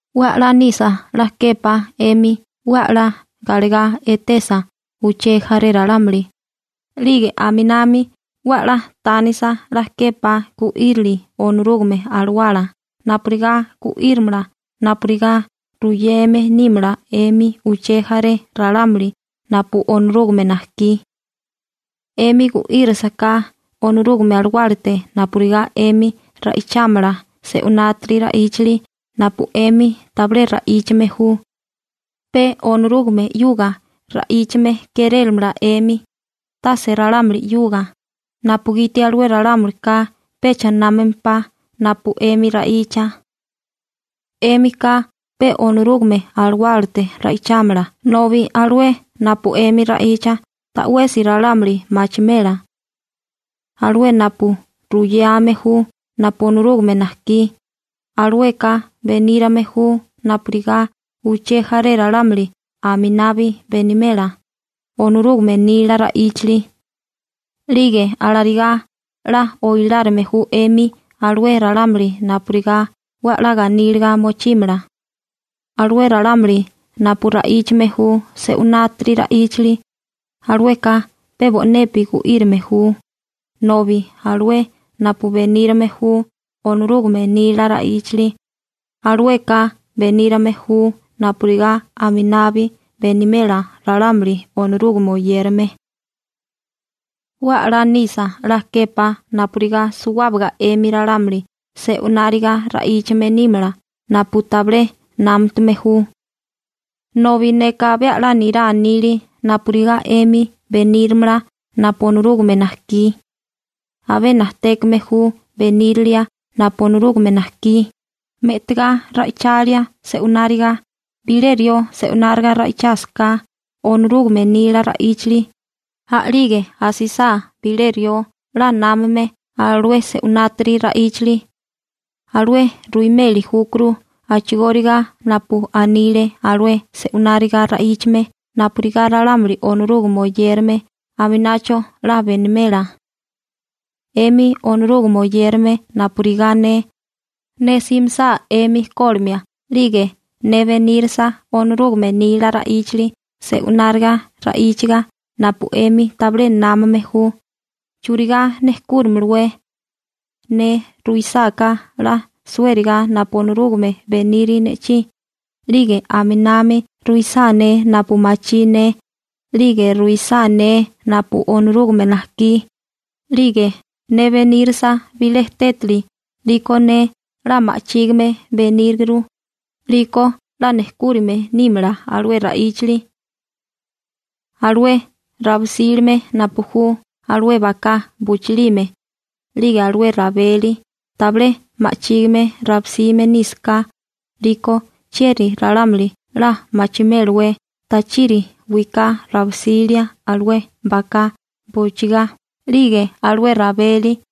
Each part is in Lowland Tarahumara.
'We a'lá nisa 'la képá 'emi 'we a'lá galegá etesa uché jaré ralámuli, 'lige aminami 'we 'la tánisa 'la képá gu'írili Onorúgame Alawala napurigá gu'írimala napurigá ruyeme nímala 'emi uché jaré ralámuli napu Onorúgame najkí. 'Emi gu'írisiká Onorúgame Alawálate napurigá 'emi ra'ichámala se'unátiri ra'íchali napu 'emi tabilé ra'íchame ju, pe Onorúgame 'yuga ra'íchame kérélamala 'emi, tase ralámuli 'yuga, napugiti alué ralámulika pecha námamempá napu 'emi ra'icha. 'Émika pe Onorúgame Alawálate ra'ichámala nobi alué napu 'emi ra'icha ta'wesi ralámuli machimela. Alué napu ruyame ju napu Onorúgame najkí, alueka benírame ju napurigá uché jaré ralámuli aminabi benimela Onorúgame nila ra'íchali. 'Lige alarigá 'la oilárime ju 'emi alué ralámuli napurigá 'we 'la ganíliga mochímala. Alué ralámuli napu ra'íchame ju se'unátiri ra'íchali, alueka pe bo'nepi gu'írame ju, nobi alué napu benírame ju Onorúgame nila ra'íchali, alueka benírame ju napurigá aminabi benimela ralámuli Onorúgame oyérame. 'We 'la nisa 'la képá napurigá suwábaga 'emi ralámuli se'unáriga ra'íchame nímala napu tabilé námutame ju. Nobi neka abé 'la nirá nili napurigá 'emi beníramala napu Onorúgame najkí. Abé najtékame ju benírilia napu Onorúgame najkí, me'tagá ra'ichalia se'unáriga. Bilé rió se'unáriga ra'ichasáká Onorúgame nila ra'íchali, a'lige asisá bilé rió 'la námame alué se'unátiri ra'íchali, alué ruimeli júkuru a'chigóriga napu anile alué se'unáriga ra'íchame napurigá ralámuli Onorúgame oyérame aminacho 'la benimela. 'Emi Onorúgame oyérame napurigá ne, ne simisá 'emi kólimia 'lige ne benírisa Onorúgame nila ra'íchali se'unáriga ra'íchaga napu 'emi tabilé námame ju, ¿churigá nejkúramalawé? Ne ruisáká 'la suériga napu Onorúgame beniri ne'chí, 'lige aminami ruisá ne napu machí ne, 'lige ruisá ne napu Onorúgame najkí, 'lige ne benírisa bilé tétali 'liko ne 'la ma'chígime beníguru, 'liko 'la nejkúrime nímala alué ra'íchali. Alué rabisílime napu ju alué baká buchilime, 'lige alué rabeli, tabilé ma'chígime rabisime nísaká, 'liko chieri ralámuli 'la machimélawé tachiri wiká rabisília alué baká bujchigá 'lige alué rabeli.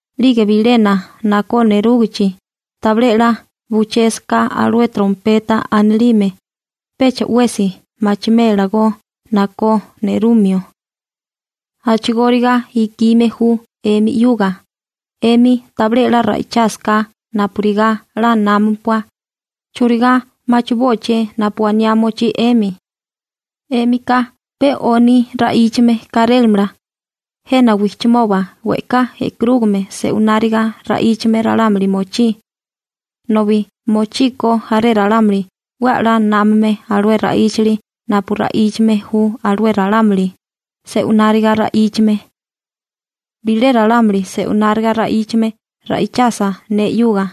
'Lige bilena nakó nerúgichi, tabilé 'la buchésaká alué trompeta anilime, pecha 'wesi machimélagó nakó nerumio. A'chigóriga ikime ju 'emi 'yuga, 'emi tabilé 'la ra'ichásaká napurigá 'la námapua, ¿churigá machibóaché napu aniá mochí 'emi? 'Émika pe 'oni ra'íchame kárélamala. Jena wijchimoba we'ká e'karúgame se'unáriga ra'íchame ralámuli mochí. Nobi mochíkó jaré ralámuli 'we 'la námame alué ra'íchali napu ra'íchame ju alué ralámuli se'unáriga ra'íchame. Bilé ralámuli se'unáriga ra'íchame ra'ichasa ne 'yuga,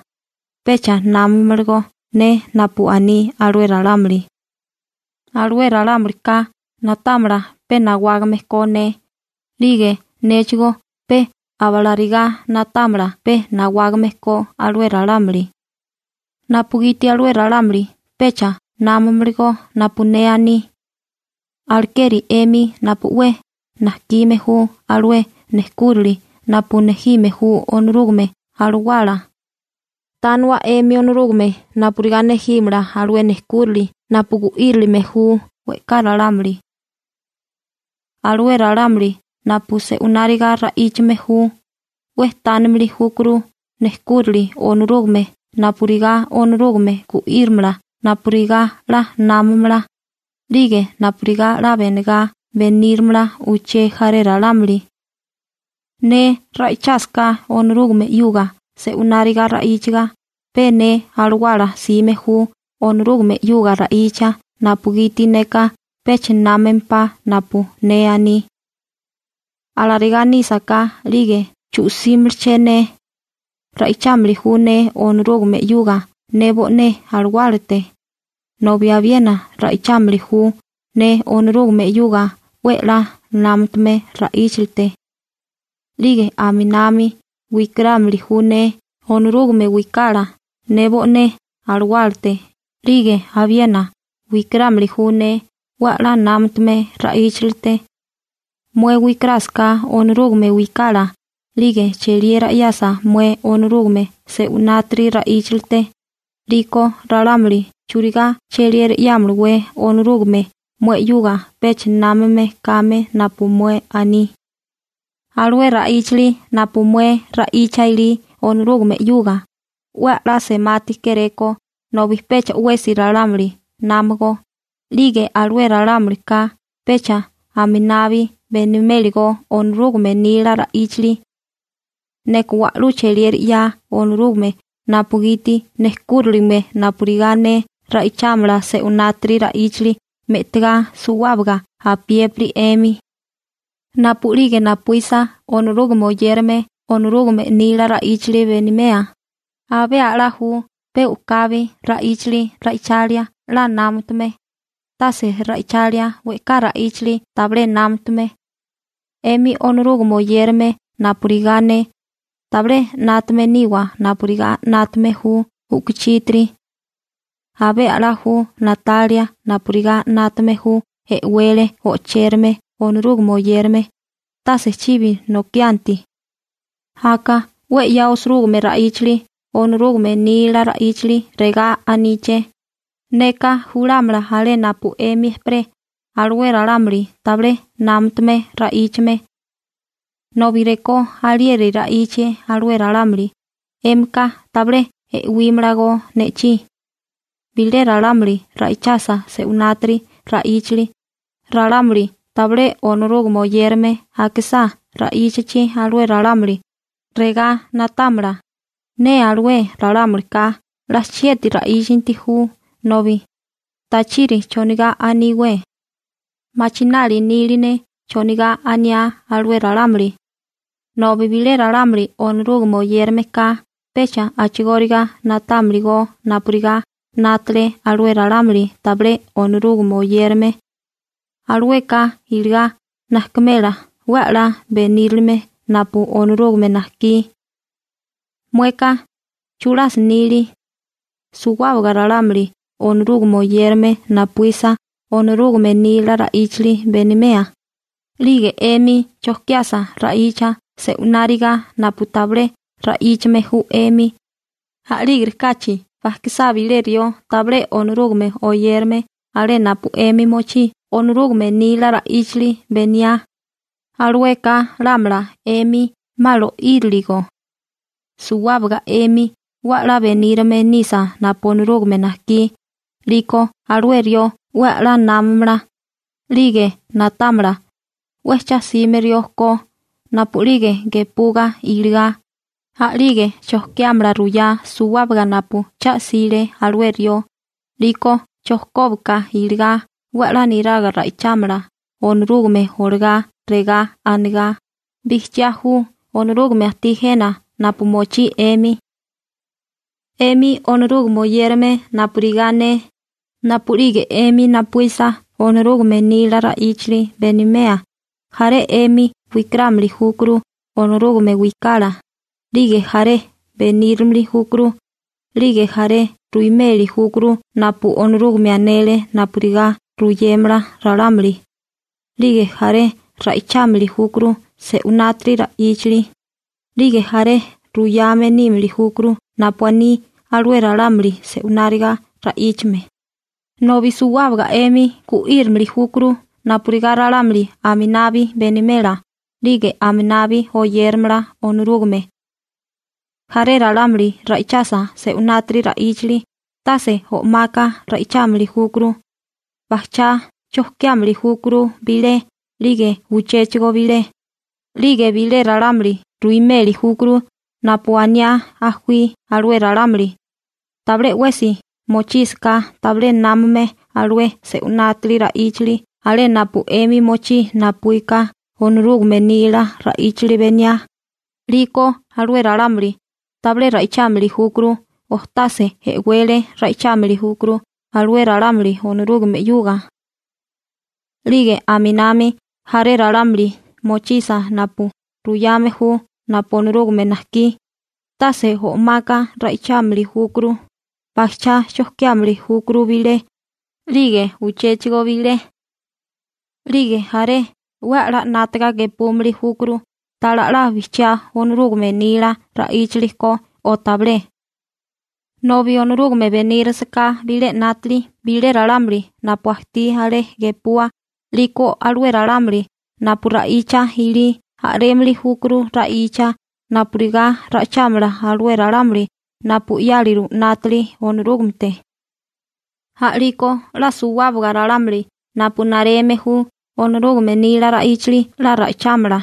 pecha námamalagó ne napu aní alué ralámuli. Alué ralámulika na'támala pe nawágame ko ne. 'Lige néchigó pe abalarigá na'támala pe nawágame ko alué ralámuli, napugiti alué ralámuli pecha námamalagó napu ne aní. Alekeri 'emi napu 'we najkime ju alué nejkúrili napu nejime ju Onorúgame Alawala, tániwa 'emi Onorúgame napurigá nejímala alué nejkúrili napu gu'írilime ju we'ká ralámuli. Alué ralámuli napu se'wináriga ra'íchame ju, 'we tánimili júkuru nejkúrili Onorúgame napurigá Onorúgame gu'írimala napurigá 'la námamala, 'lige napurigá 'la benegá beníramala uché jaré ralámuli. Ne ra'ichásaká Onorúgame 'yuga se'wináriga ra'íchaga pe ne alawala 'sime ju Onorúgame 'yuga ra'icha napugiti neka pecha námempá napu ne aní. Alarigá nísaká, 'lige ¿chu'símalaché ne? Ra'ichámili ju ne Onorúgame 'yuga ne bo'né alawálate, abiena ra'ichámili ju ne Onorúgame 'yuga 'we 'la námatume ra'íchilite. 'Lige aminami wikarámili ju ne Onorúgame wikala, ne bo'né alawálate, 'lige abiena wikarámili ju ne 'we 'la námatume wiká. Mué wikarásaká Onorúgame wikala 'lige cheliera 'yasa mué Onorúgame se'winátiri ra'íchilite, 'liko ralámuli ¿churigá cheliera 'yámalawé Onorúgame mué 'yuga pecha námame kame napu mué aní? Alué ra'íchali napu mué ra'icha ilí Onorúgame 'yuga, 'we 'la semati kéréko, nobi pecha 'wesi ralámuli námago, 'lige alué ralámulika pecha aminabi beniméligó Onorúgame nila ra'íchali. Neka wa'lú cheliera 'ya Onorúgame napugiti nejkúriligime napurigá ne ra'ichámala se'unátiri ra'íchali me'tigá suwábaga apiépiri 'emi. Napu'lige napuísa Onorúgame oyérame Onorúgame nila ra'íchali benimea, abé a'lá ju pe u'kabi ra'íchali ra'ichalia 'la námatume, tase ra'ichalia we'ká ra'íchali tabilé námatume. 'Emi Onorúgame oyérame napurigá ne, tabilé 'nátame niwa napurigá 'nátame ju u'kuchítiri. Abé 'la ju na'talia napurigá 'nátame ju e'wele o'chérame Onorúgame oyérame, tase chibi nokianti. Aka 'we 'ya osirúgime ra'íchali Onorúgame nila ra'íchali regá aníché: «Neka julámala alé napu 'emi ejperé alué ralámuli tabilé námatame ra'íchame. Nobi rekó alieri ra'íchie alué ralámuli, 'émika tabilé e'wímalago ne'chí.» Bilé ralámuli ra'ichasa se'unátiri ra'íchali, ralámuli tabilé Onorúgame oyérame akisá ra'íchachi alué ralámuli, regá na'támala: 'Nee alué ralámulika 'la chieti ra'íchanti ju, nobi ¿tachiri chonigá aníwé? Machinali nili ne chonigá aniá alué ralámuli. Nobi bilé ralámuli Onorúgame oyérameka pecha a'chigóriga na'támili go napurigá 'nátale alué ralámuli tabilé Onorúgame oyérame. Alueka iligá najkimela 'we 'la benírilime napu Onorúgame najkí. Mueka ¿chulasi nili? Suwábaga ralámuli Onorúgame oyérame napuísa Onorúgame nila ra'íchali benimea, 'lige 'emi chojkiasa ra'icha se'wináriga napu tabilé ra'íchame ju 'emi, a'lígirikáchi bajkisá bilé rió tabilé Onorúgame oyérame alé napu 'emi mochí Onorúgame nila ra'íchali beniá, alueka lámala 'emi 'ma lo'íriligo. Suwábaga 'emi 'we 'la benírame nisa napu Onorúgame najkí, 'liko alué rió 'we 'la námamala, 'lige na'támala, 'we cha'sime rió ko, napu'lige gepuga iligá, a'lige chojkiámala ruyá suwábaga napu cha'sile alué rió, 'liko chojkóbaka iligá 'we 'la niraga ra'ichámala Onorúgame olagá regá anigá: Bijchiá ju Onorúgame ajtí jena napu mochí 'emi. 'Emi Onorúgame oyérame napurigá ne, napu'lige 'emi napuísa Onorúgame nila ra'íchali benimea, jaré 'emi wikarámili júkuru Onorúgame wikala, 'lige jaré benírimili júkuru, 'lige jaré ruimeli júkuru napu Onorúgame anele napurigá ruyémala ralámuli, 'lige jaré ra'ichámili júkuru se'winátiri ra'íchali, 'lige jaré ruyame nímili júkuru napu aní alué ralámuli se'wináriga ra'íchame, nobi suwábaga 'emi gu'írimili júkuru napurigá ralámuli aminabi benimela 'lige aminabi oyéramala Onorúgame. Jaré ralámuli ra'ichasa se'unátiri ra'íchali, tase o'maka ra'ichámili júkuru, bajchá chojkiámili júkuru bilé 'lige uchéchigo bilé, 'lige bilé ralámuli ruimeli júkuru napu aniá ajuí alué ralámuli, tabilé 'wesi mochísaká tabilé námame alué se'winátiri ra'íchali alé napu 'emi mochí napuíka Onorúgame nila ra'íchali beniá, 'liko alué ralámuli tabilé ra'ichámili júkuru o tase e'wele ra'ichámili júkuru alué ralámuli Onorúgame 'yuga. 'Lige aminami jaré ralámuli mochisa napu ruyame ju napu Onorúgame najkí, tase o'maka ra'ichámili júkuru, bajchá chojkiámili júkuru bilé, 'lige uchéchigo bilé. 'Lige jaré 'we 'la 'nátaga gepúmili júkuru ta'lá 'la bijchiá Onorúgame nila ra'íchali ko o tabilé. Nobi Onorúgame benírasaká bilé 'nátali bilé ralámuli napu ajtí alé gepua, 'liko alué ralámuli napu ra'icha ilí a'rémili júkuru ra'icha napurigá ra'ichámala alué ralámuli napu 'yáliru 'nátali Onorúgamete. A'liko 'la suwábaga ralámuli napu nareme ju Onorúgame nila ra'íchali 'la ra'ichámala,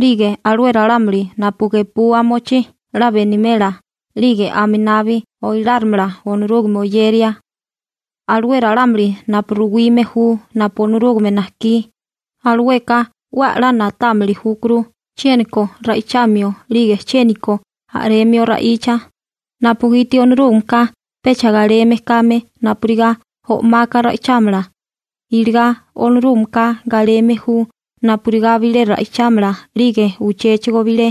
'lige alué ralámuli napu gepua mochí 'la benimela 'lige aminabi oilárimala Onorúgame oyeria. Alué ralámuli napu ruwime ju napu Onorúgame najkí, alueka 'we 'la na'támili júkuru chiéniko ra'ichamio 'lige chiéniko a'remio ra'icha, napugiti Onorúgameka pecha galeme kame napurigá o'maka ra'ichámala, iligá Onorúgameka galeme ju napurigá bilé ra'ichámala 'lige uchéchigo bilé.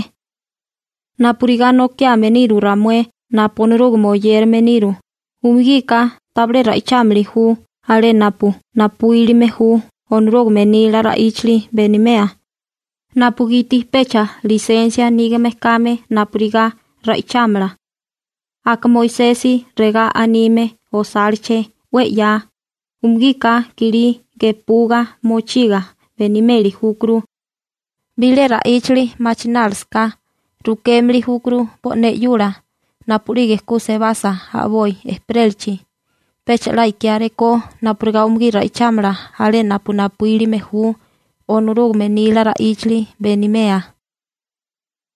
Napurigá nokiame niru ramué napu Onorúgame oyérame niru, umugika tabilé ra'ichámili ju alé napu napuílime ju Onorúgame nila ra'íchali benimea, napugiti pecha lisensia nígame kame napurigá ra'ichámala. Aka Moisesi regá anime osáleché 'we 'ya: «Umugika kilí gepuga mochiga benimeli júkuru.» Bilé ra'íchali machinálisaká, rukémili júkuru bo'né 'yula napu'lige ku sebasa a'boi ejperélachi. Pecha 'la ikiáré ko napurigá umugí ra'ichámala alé napu napuílime ju Onorúgame nila ra'íchali benimea.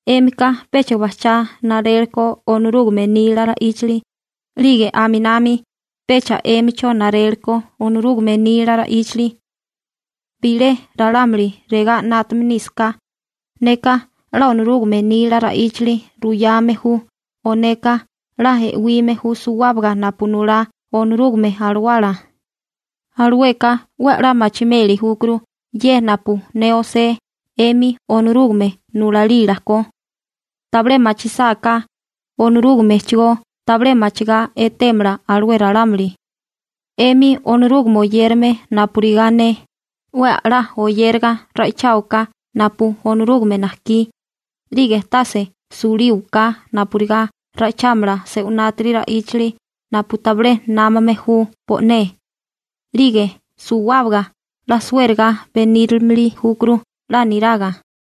'Émika pecha bajchá naréleko Onorúgame nila ra'íchali, 'lige aminami pecha 'émicho naréleko Onorúgame nila ra'íchali. Bilé ralámuli regá 'nátame nísaká: «Neka 'la Onorúgame nila ra'íchali ruyame ju o neka 'la e'wime ju suwábaga napu nulá Onorúgame Alawala», alueka 'we 'la machimeli júkuru ye napu ne osé 'emi Onorúgame nulalila ko. Tabilé machisáká, Onorúgamechigó tabilé machigá etémala alué ralámuli. 'Emi Onorúgame oyérame napurigá ne, 'we 'la oyéraga ra'icháwaká napu Onorúgame najkí, 'lige tase sulíwaká napurigá ra'ichámala se'unátiri ra'íchali napu tabilé námame ju bo'né. 'Lige suwábaga 'la suériga benírimili júkuru 'la niraga.